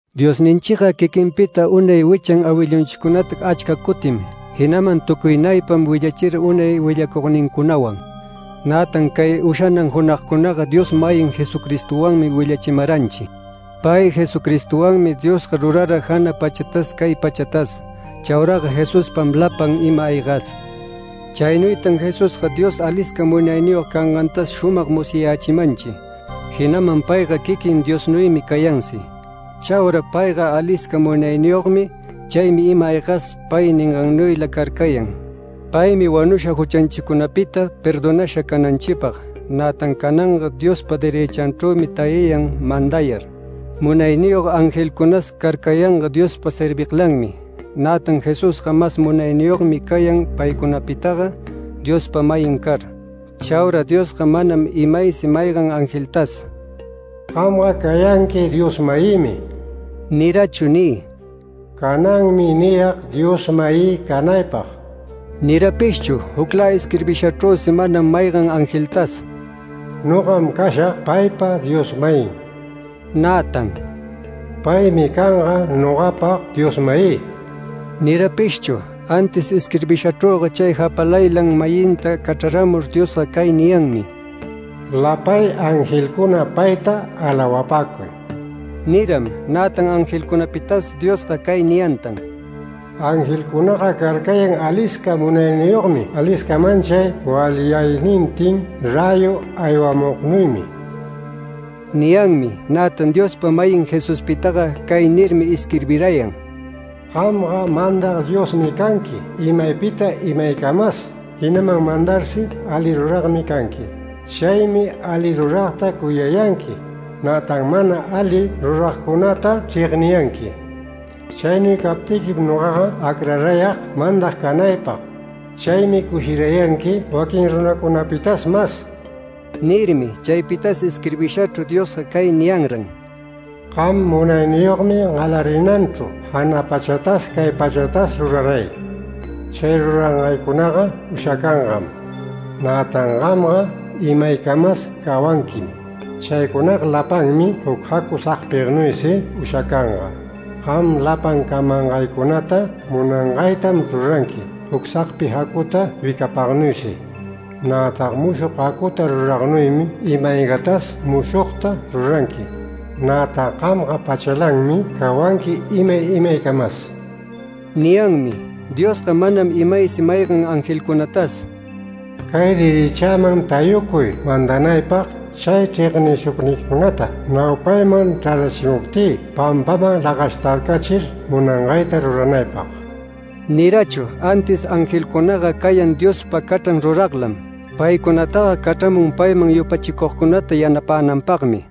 Diosninchiga quiquinpita unay wichan awillunchicunata achca cutim, jinaman tucuynaypam willachira unay willacugnincunawan. Nätan cay ushanan junagcunaga Dios-mayin Jesucristowanmi willachimaranchi. Pay Jesucristowanmi Diosga rurara jana pachatas cay pachatas. Chauraga Jesuspam lapan ima-aygas. Chaynuytan Jesusga Dios alisca munayniyog cangantas shumag musyayächimanchi, jinaman payga quiquin Diosnuymi cayansi. Chaura payga alisca munayniyogmi, chaymi ima-aygas pay ningannuyla carcayan. Paymi wanusha juchanchicunapita perdonasha cananchipag, nätan cananga Diospa derëchanchrümi tayayan mandayar. Munayniyog angelcunas carcayanga Diospa serviglanmi, nätan Jesusga mas munayniyogmi cayan paycunapitaga Diospa-mayin car. Chaura Diosga manam imaysi maygan angeltas: “Gamga cayanqui Dios-mayïmi” nirachu ni “Cananmi niyag Dios-mayï canaypag” nirapishchu. Juclä isquirbishachrüsi manam maygan angeltas: “Nogam cashag paypa Dios-mayin”, nätan “Paymi canga nogapa Dios-mayï” nirapishchu. Antis isquirbishachrüga chay japalaylan-mayinta cachraramur Diosga cay niyanmi: “Lapay angelcuna payta alawapäcuy” niram. Nätan angelcunapitas Diosga cay niyantan: “Angelcunaga carcayan alisca munayniyogmi alisca manchay walyaynintin räyu aywamugnuymi” niyanmi. Nätan Diospa-mayin Jesuspitaga cay nirmi isquirbirayan: “Gamga mandag Diosmi canqui imaypita imaycamas, jinaman mandarsi ali ruragmi canqui. Chaymi ali ruragta cuyayanqui, nätan mana ali ruragcunata chregniyanqui. Chaynuy captiquim nogaga acrarayag mandag canaypag. Chaymi cushirayanqui waquin runacunapitas mas” nirmi. Chaypitas isquirbishachru Diosga cay niyanran: “Gam munayniyogmi galarinanchru jana pachatas cay pachatas ruraray. Chay rurangaycunaga ushacangam, nätan gamga imaycamas cawanquim. Chaycunaga lapanmi juc jacu sagpinuysi ushacanga. Gamga lapan camangaycunata munangaytam ruranqui juc sagpi jacuta wicapagnuysi. Nätan mushog jacuta ruragnuymi ima-aygatas mushogta ruranqui. Nätan gamga pachalanmi cawanqui imay imaycamas” niyanmi. Diosga manam imaysi maygan angelcunatas “Cay derëchäman tayucuy mandanaypag, chay chregnishugniquicunata naupayman chrarachimuptï pampaman lagashtarcachir munangayta ruranaypag” nirachu. Antis angelcunaga cayan Diospa cachran ruraglam. Paycunataga cachramun payman yupachicugcunata yanapänanpagmi.